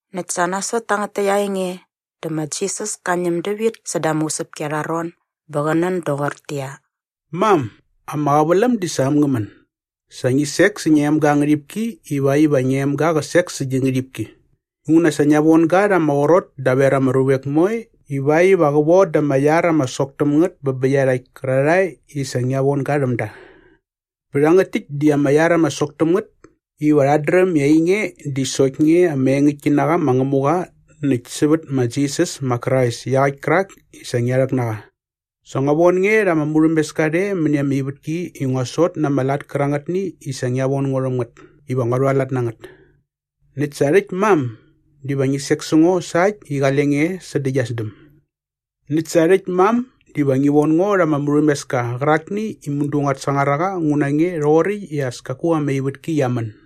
Näkt sa nasot tangät täkt aa enge dä ma Jisas ka ñäm dävit säda ama usäpki arha ron bä qä nän doqortäqyia, “Mam, ama qäväläm di sa äm ngä män. Sa ngi sek sä ngia emga aa ngärhipki ivakt iva ngia emga qä sek sä gi ngärhipki. Inguna sa ngia von ga rha ama qrot daver ama ruvek moe ivakt iva qä von dä ama iar ama sok täm ngät bä bä iarhakt kärarhae i sa ngia von ga rhäm da. Bä rhangät täkt di ama iar ama sok täm ngät iva rhat dräm i ainge di sokt nge ama engäktki na qa ma Ngämuqa näkt sävät ma Jisas ma Krais iaqäkt kärak i sa ngia rhäk na qa. Sa ngua von nge rha ama murhämeska rhe mäni ama ivätki i ngua sot na ama lat kärangätni i sa ngia von ngo rhäm ngät iva ngua rhualat na ngät. Näkt sa rhäkt mam, diva ngi sek sä ngo sa äkt i qale nge e sädä gia sdäm. Näkt sa rhäkt mam, diva ngi von ngo rha ama murhämeska qärakni i mudu nguat sangar a qa ngu na nge rhoqoräkt i as kaku ama ivätki qia män.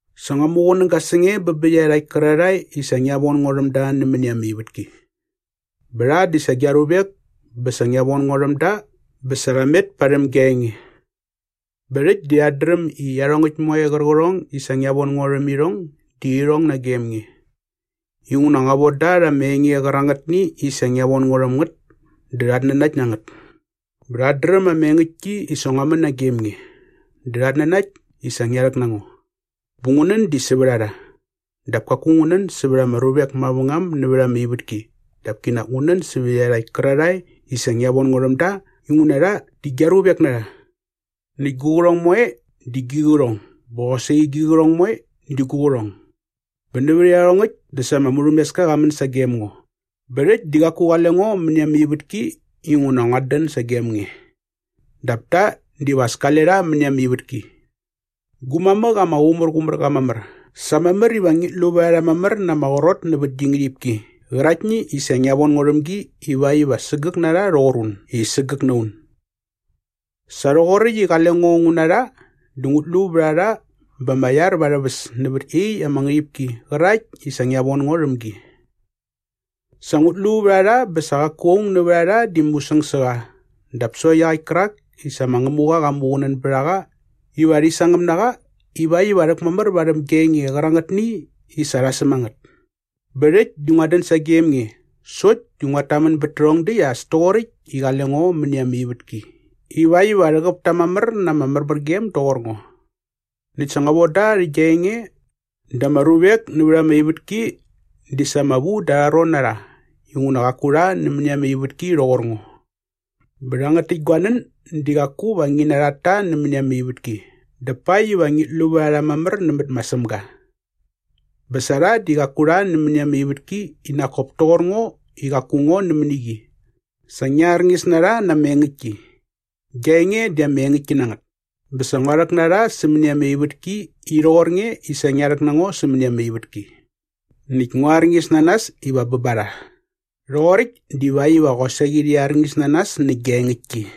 “Sa ngua muqunäga sä nge bä bä iarhakt kärarhae i sa ngia von ngo rhäm da nämäni ama ivätki. Bä rha di sa gia ruvek bä sa ngia von ngo rhäm da bä sa rha met parhäm gia enge. Bä rhäkt di rhat dräm i iarhongäkt moe qärqärhong i sa ngia von ngo rhäm irhong di irhong nagem nge. Inguna ngua von da rha ama enge qärangätni i sa ngia von ngo rhäm ngät dä rhat nanakt na ngät. Bä rhat dräm ama engäktki i sa ngua män nagem nge dä rhat nanakt i sa ngia rhäk na ngo. Bä ngu nän di sävät a rha. Dap kaku ngu nän sävät ama ruvek mavängam nävät ama ivätki dap kinak ngu nän sävät iarhakt kärarhae i sa ngia von ngo rhäm da inguna rha di gia ruvek na rha. Näkt gu qärhong moe di gi qärhong bä qosaqi gi qärhong moe di gu qärhong. Bä nävät iarhongäkt dä sa ama murhämeska qa män sagem ngo. “Bä rhäkt di qaku qale ngo mäni ama ivätki inguna nguat dän sagem nge. Dap ta diva as kale rha mäni ama ivätki. Gu mamäk ama qumärqumär qa mamär, sa mamär iva ngit lu vät a rha mamär na ama qrot nävät gi ngärhipki qäraktni i sa ngia von ngo rhäm gi iväkt iva sägäk na rha rhoqor un i sägäk na un. Sa rhoqoräkt i qale ngo ngu na rha dä ngut lu vät a rha bä ama iar va arhä väs nävät iaqyäkt ama ngärhipki qärakt i sa ngia von ngo rhäm gi. Sa ngut lu vät a rha bä sa qaku aung nävät a rha di musäng sä qa dap sokt iaqäkt kärak i sa ma Ngämuqa qa muqunän bät a qa iva rhi sangäm na qa ivakt iva rhäkmamär varhäm gia enge qärangätni i sa rha säm a ngät. “Bä rhäkt di nguat dän sagem nge sokt di nguat tamän bät tärhärhong däkt as toqoräkt i qale ngo mäni ama ivätki ivakt iva rhäqäp ta mamär na ama märmärgem doqor ngo. Näkt sa ngua von da rhä gia enge dä ama ruvek nävät ama ivätki di sa ama vu da arha ron na rha inguna qaku rha nämäni ama ivätki rhoqor ngo. “Bä rhangät täkt gua nän di qaku va ngi narhat ta nämäni ama ivätki dap pakt iva ngit lu vät a rha mamär nämät ma Sämga. Bä sa rha di qaku rha nämäni ama ivätki i nak kop toqor ngo i qaku ngo nämäni qi. Sa ngia arñis na rha na ama engäktki. Gia enge di ama engäktki na ngät. Bä sa ngua rhäk na rha sämäni ama ivätki i rhoqor nge i sa ngia rhäk na ngo sämäni ama ivätki. Näkt ngua arñis na nas iva bä ba rha. Rhoqoräkt divakt iva qosaqi rhi arñis na nas nä gia engäktki.”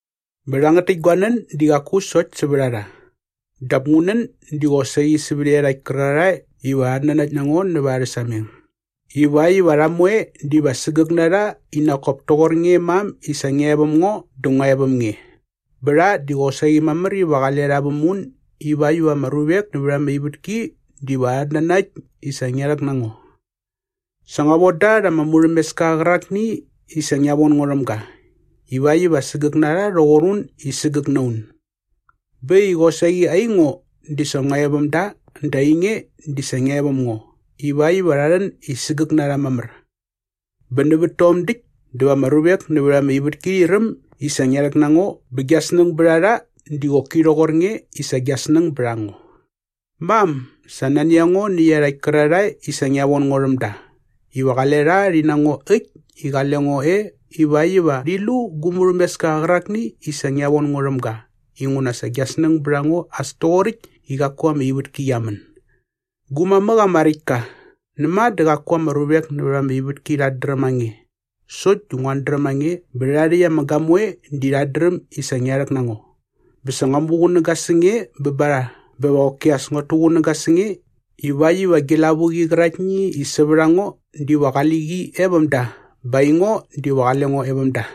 “Bä rhangät täkt gua nän di qaku sokt sävät a rha. Dap ngu nän di qosaqi sävät iarhakt kärarhae iva rhat nanakt na ngo nävät arhä sameng ivakt iva rha moe diva sägäk na rha i nak kop toqor nge mam i sa ngia e väm ngo dä ngua e väm nge. Bä rha di qosaqi mamär iva qale rha väm un ivakt iva ama ruvek nävät ama ivätki diva rhat nanakt i sa ngia rhäkt na ngo. “Sa ngua von da rha ama murhämeska qärakni i sa ngia von ngo rhäm ga ivakt iva sägäk na rha rhoqor un i sägäk na un. Bä äkt i qosaqi aingo di sa ngua e väm da dä ainge di sa ngia e väm ngo ivakt iva rha rhän i sägäk na rha mamär. Bä nävät tom däkt dä va ama ruvek nävät ama ivätki rhi räm i sa ngia rhäk na ngo bä gia snäng bät a rha di qoki rhoqor nge i sa gia snäng bät a ngo. “Mam, sa nani a ngo nä iarhakt kärarhae i sa ngia von ngo rhäm da iva qale rha rhi na ngo äkt i qale ngo e ivakt iva rhi lu gu murhämeska qärakni i sa ngia von ngo rhäm ga inguna sa gia snäng bät a ngo as toqoräkt i qaku ama ivätki qia män.” “Gu mamäk ama räkt ka, näma dä qaku ama ruvek nävät ama ivätki rhat dräm a nge sokt di nguat dräm a nge bä rhärha rhäkt ama gamoe di rhat dräm i sa ngia rhäk na ngo. Bä sa ngua muqunäga sä nge bä ba rha bä va qoki as nguat tuqunäga sä nge ivakt iva gi lavuqi qäraktni i sävät a ngo diva qali qi e väm da bä aingo diva qale ngo e väm da.”